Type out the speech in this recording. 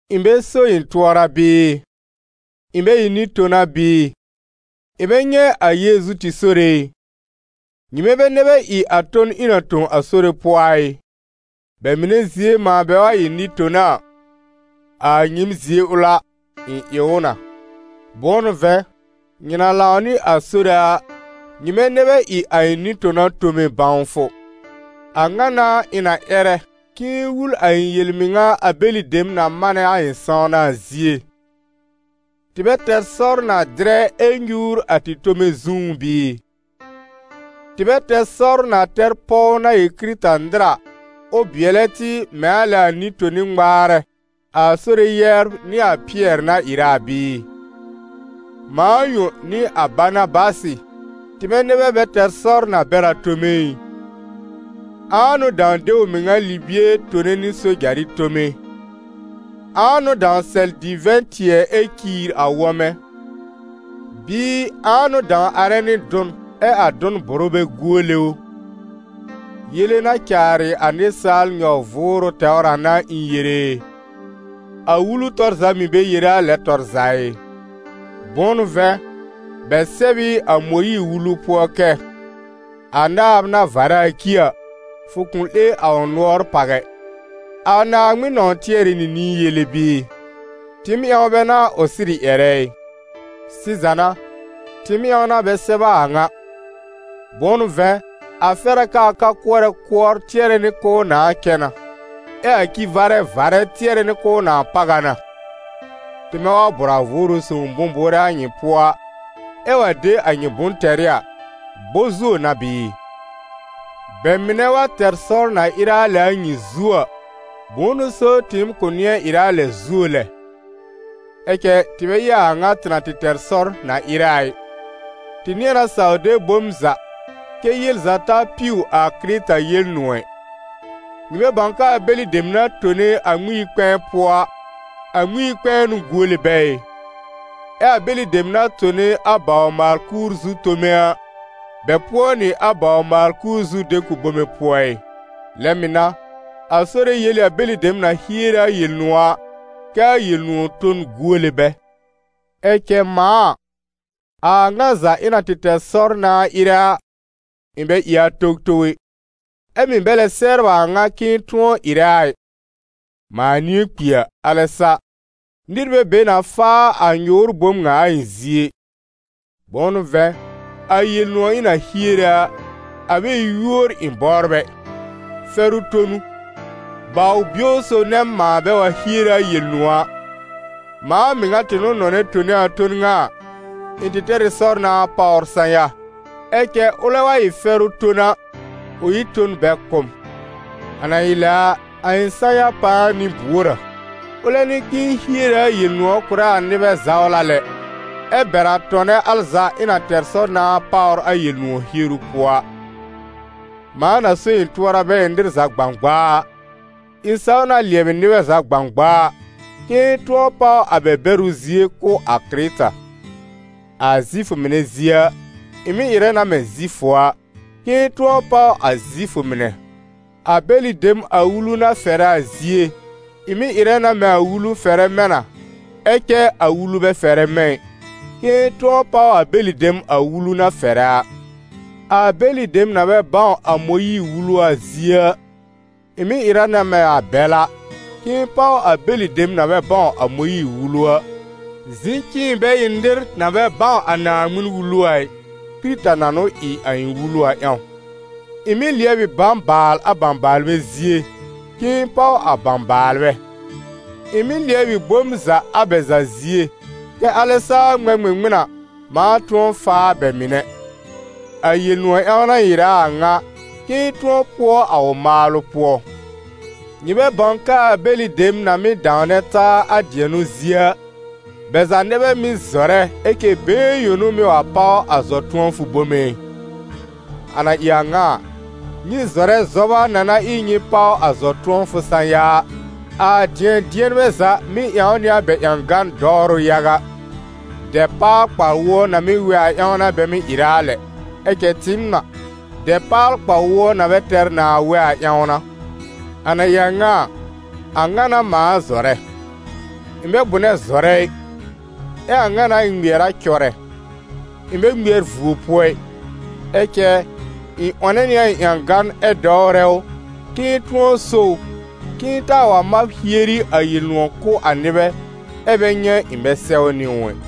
Ɩ̃ bɛ so ɩ̃ tʋɔra bɩɩ? Ɩ̃ bɛ ɩ nɩ-tona bɩɩ? Ɩ̃ bɛ nyɛ̃ a Yeezu tɩ Sore ɩ? Nyɩmɛ bɛ nɛ bɛ ɩ a ton ɩ̃ na tõ a Sore pʋɔ a ɩ? Bɛ mɩnɛ zie mãa bɛ wa ɩ nɩ-tona a, a nyɩɩm zie ʋl a, ɩ̃ ɩ ʋ na. Bʋ̃ʋ n'ʋ vɛ̃, nyɩ na lãw nɩ a Sore a, nyɩmɛ nɛ bɛ ɩ a ɩ̃ nɩ-tona tome bãwfʋ. A ŋa n'a ɩ̃ na ƴɛrɛ, k'ɩ̃ɩ wul a ɩ̃ yel-mɩŋa a bɛlɩ dem na manɛ a ɩ̃ sãwna a zie: tɩ bɛ tɛr sɔr na dɩrɛ ɛ nyuur a tɩ tome zũú bɩɩ? Tɩ bɛ tɛr sɔr na tɛr pɔw na ɩ Kɩrɩta-nɩr a, ʋ bɩɛlɛ tɩ mɛ̃ a lɛ a nɩ-toni ŋmaarɛ, a Sore yɛbr nɩ a Pɩɛr na ɩrɛ a bɩɩ? Mãa yõ nɩ a Banabasɩ, tɩmɛ nɛ bɛ bɛ tɛr sɔr na bɛr a tome ɩ? Ãa n'ʋ dãw de ʋ mɩŋa libie tone nɩ sojarɩ tome? Ãa n'ʋ dãw sɛl divɛ̃-tɩɛ ɛ ciir a wɔ̃mɛ? Bɩɩ ãa n'ʋ dãw arɛ nɩ dʋn ɛ a dʋn bʋrʋ bɛ guole ʋ? Yele na caarɩ a nɩsaal nyɔ-vʋʋrʋ tɛwr a n'a ɩ̃ yere e? A Wulu tɔr za mɩ̀ bɛ yere a lɛn tɔr za ɩ? Bʋ̃ʋ n'ʋ vɛ̃, bɛ sɛb ɩ a Mõyiir-Wulu pʋɔ kɛ: «A naab na varɛ a ci a, fʋ kʋ̃ 'lẽ a ʋ nʋɔr pàw ɛ.» A Naaŋmɩn nɔ̃w tɩɛrɛ nɩ nĩi yele bɩɩ? Tɩɩm ƴãw bɛ n'a ʋ sɩrɩ ƴɛrɛ ɩ? Sɩza n'a, tɩɩm ƴãw n'a bɛ sɛb a a ŋa; bʋ̃ʋ n'ʋ vɛ̃, a fɛr a kɛ a ka-kʋɔra kʋɔr tɩɛrɛ nɩ k'ʋʋ nãa cɛ na, ɛ ci-varɛ varɛ tɩɛrɛ nɩ k'ʋʋ nãa páw a na. Tɩmɛ wa bʋ̀r a Vʋʋrʋ Sõw bʋ̃-bʋʋrɛ a nyɩ pʋɔ a, ɛ wa de a nyɩ bʋ̃-tɛrɩ a, bɔ-zuo n'a bɩɩ? Bɛ mɩnɛ wa tɛr sɔr na ɩrɛ a lɛ a nyɩ zu, bʋ̃ʋ n'ʋ so tɩɩm kʋ̃ nɩ̃ɛ ɩrɛ a lɛ zuo lɛ? Ɛ cɛ tɩ bɛ ɩ a a ŋa tɩ na tɩ tɛr sɔr na ɩrɛ a ɩ. Tɩ nɩ̃ɛ na saw de bom za, kɛ́ yel za ta piw a Kɩrɩta Yel-nʋ̃ɔ̀ ɛ. Nyɩ bɛ bãw k'aa bɛlɩ dem na tone a Ŋmɩn-yi-kpɛ̃ɛ pʋɔ a, a Ŋmɩn-yi-kpɛ̃ɛ n'ʋ guole bɛ ɩ? Ɛ a bɛlɩ dem na tone a bawr-maal-kuur zu tome a, bɛ pʋɔ nɩ a bawr-maal-kuur zu de-kʋb bome pʋɔ ɩ? Lɛ mɩ̀ n'a, a Sore yel ɩ a bɛlɩ dem na hiere a Yel-nʋ̃ɔ̀ a, kɛ a Yel-nʋ̃ɔ̀ ton guole bɛ. Ɛ cɛ mãa a, a a ŋa za ɩ̃ na tɩ tɛr sɔr nãa ɩrɛ a, ɩ̃ bɛ ɩ a towtow ɛ, ɛ mɩ̀ bɛ lɛ sɛbr a a ŋa k'ɩ̃ɩ tʋ̃ɔ ɩrɛ a ɩ. Mãa nɩ̃ɛ kpi a, alɛ sa. Nɩr bɛ be na faa a nyʋʋr bom ŋa a ɩ̃ zie ɩ. Bʋ̃ʋ n'ʋ vɛ̃, a Yel-nʋ̃ɔ̀ ɩ̃ na hiere a, a bɛ ɩ yúor ɩ̃ bɔbr ɛ, fɛrʋ ton n'ʋ. Baw-bio sob nɛ m, mãa bɛ wa hiere a Yel-nʋ̃ɔ̀ a. Mãa mɩŋa tɩ n'ʋ nɔnɛ tone a ton ŋa a, ɩ̃ tɩ tɛr ɩ sɔr nãa páwr sã-ya. Ɛ cɛ ʋlɛ wa ɩ fɛrʋ ton a, ʋ ɩ n ton bɛ kʋ̀ m. A na ɩ lɛ a, a ɩ̃ sã-ya pãa n'ɩ buor a? Ʋlɛ n'ɩ k'ɩ̃ɩ hiere a Yel-nʋ̃ɔ̀ kʋ̀rɛ a nɩbɛ zawla lɛ, ɛ bɛr a tɔnɛ al za ɩ̃ na tɛr sɔr nãa páwr a Yel-nʋ̃ɔ̀ hieru pʋɔ a. Mãa na so ɩ̃ tʋɔra bɛ ɩ nɩr za gbãgbaa a, ɩ̃ saw na lɩɛbɩ nɩbɛ za gbãgbaa, k'ɩ̃ɩ tʋ̃ɔ páw a bɛ bɛrʋ zie kʋ̀ a Kɩrɩta. A Zifʋ mɩnɛ zie a, ɩ̃ mɩ́ ɩrɛ na mɛ̃ Zifʋ a, k'ɩ̃ɩ tʋ̃ɔ páw a Zifʋ mɩnɛ; a bɛlɩ dem a Wulu na fɛrɛ a zie, ɩ̃ mɩ́ ɩrɛ na mɛ̃ a Wulu fɛrɛ mɛ̃ na, ɛ cɛ a Wulu bɛ fɛrɛ mɛ̃ ɩ, k'ɩ̃ɩ tʋ̃ɔ páw a bɛlɩ dem a Wulu na fɛrɛ a. A bɛlɩ dem na bɛ bãw a Mõyiir-Wulu a zie a, ɩ̃ mɩ́ ɩrɛ na mɛ̃ a bɛl a, k'ɩ̃ɩ páw a bɛlɩ dem na bɛ bãw a Mõyiir-Wulu a, zɩ̃ kɛ ɩ̃ bɛ ɩ nɩr na bɛ bãw a Naaŋmɩn-Wulu a ɩ, Kɩrɩta na n'ʋ ɩ a ɩ̃ wulu a ƴãw. Ɩ̃ mɩ́ lɩɛb ɩ bãbaal a bãbaalbɛ zie, k'ɩ̃ɩ páw a bãbaalbɛ. Ɩ̃ mɩ́ lɩɛb ɩ bom za a bɛ za zie, kɛ alɛ saa ŋmɛ̃ ŋmɩŋmɩn a, mãa tʋ̃ɔ faa bɛ mɩnɛ. A Yel-nʋ̃ɔ̀ ƴãw n'a ɩ̃ ɩrɛ a a ŋa, k'ɩ̃ɩ tʋ̃ɔ pʋɔ a ʋ maalʋ pʋɔ. Nyɩ bɛ bãw k'aa bɛlɩ dem na mɩ́ dãwnɛ taa a dɩɛnʋ zie a, bɛ za nɛ bɛ mɩ́ zɔrɛ, ɛ cɛ been yõ n'ʋ mɩ́ wa páw a zɔ-tʋ̃ɔfʋ bom ɛ? A na ɩ a ŋa a, nyɩ zɔrɛ zɔba na na ɩ nyɩ páw a zɔ-tʋ̃ɔfʋ sã-ya a. A dɩ̃ɛ-dɩɛnbɛ za mɩ́ ƴãw nɩ a bɛ ƴãgan dɔwrʋ yaga; dɛpaal-kpa-wʋɔ na mɩ́ wɛ a ƴãw n'a bɛ mɩ́ ɩrɛ a lɛ, ɛ cɛ tɩɩm a, dɛpaal-kpa-wʋɔ na bɛ tɛr nãa wɛ a ƴãw n'a. A na ɩ a ŋa a, a ŋa n'a mãa zɔrɛ: ɩ̃ bɛ bʋnɛ zɔrɛ ɩ; ɛ a ŋa n'a ɩ̃ ŋmɩɛr a cɔrɛ: ɩ̃ bɛ ŋmɩɛr vuo pʋɔ ɩ. Ɛ cɛ ɩ̃ 'wɔnɛ nɩ a ɩ̃ ƴãgan ɛ dɔwrɛ ʋ, k'ɩ̃ɩ tʋ̃ɔ so ʋ, k'ɩ̃ɩ taa wa mab hieri a Yel-nʋ̃ɔ̀ kʋ̀ a nɩbɛ, ɛ́ bɛ nyɛ̃ ɩ̃ bɛ sɛwnɩ ʋ ɛ.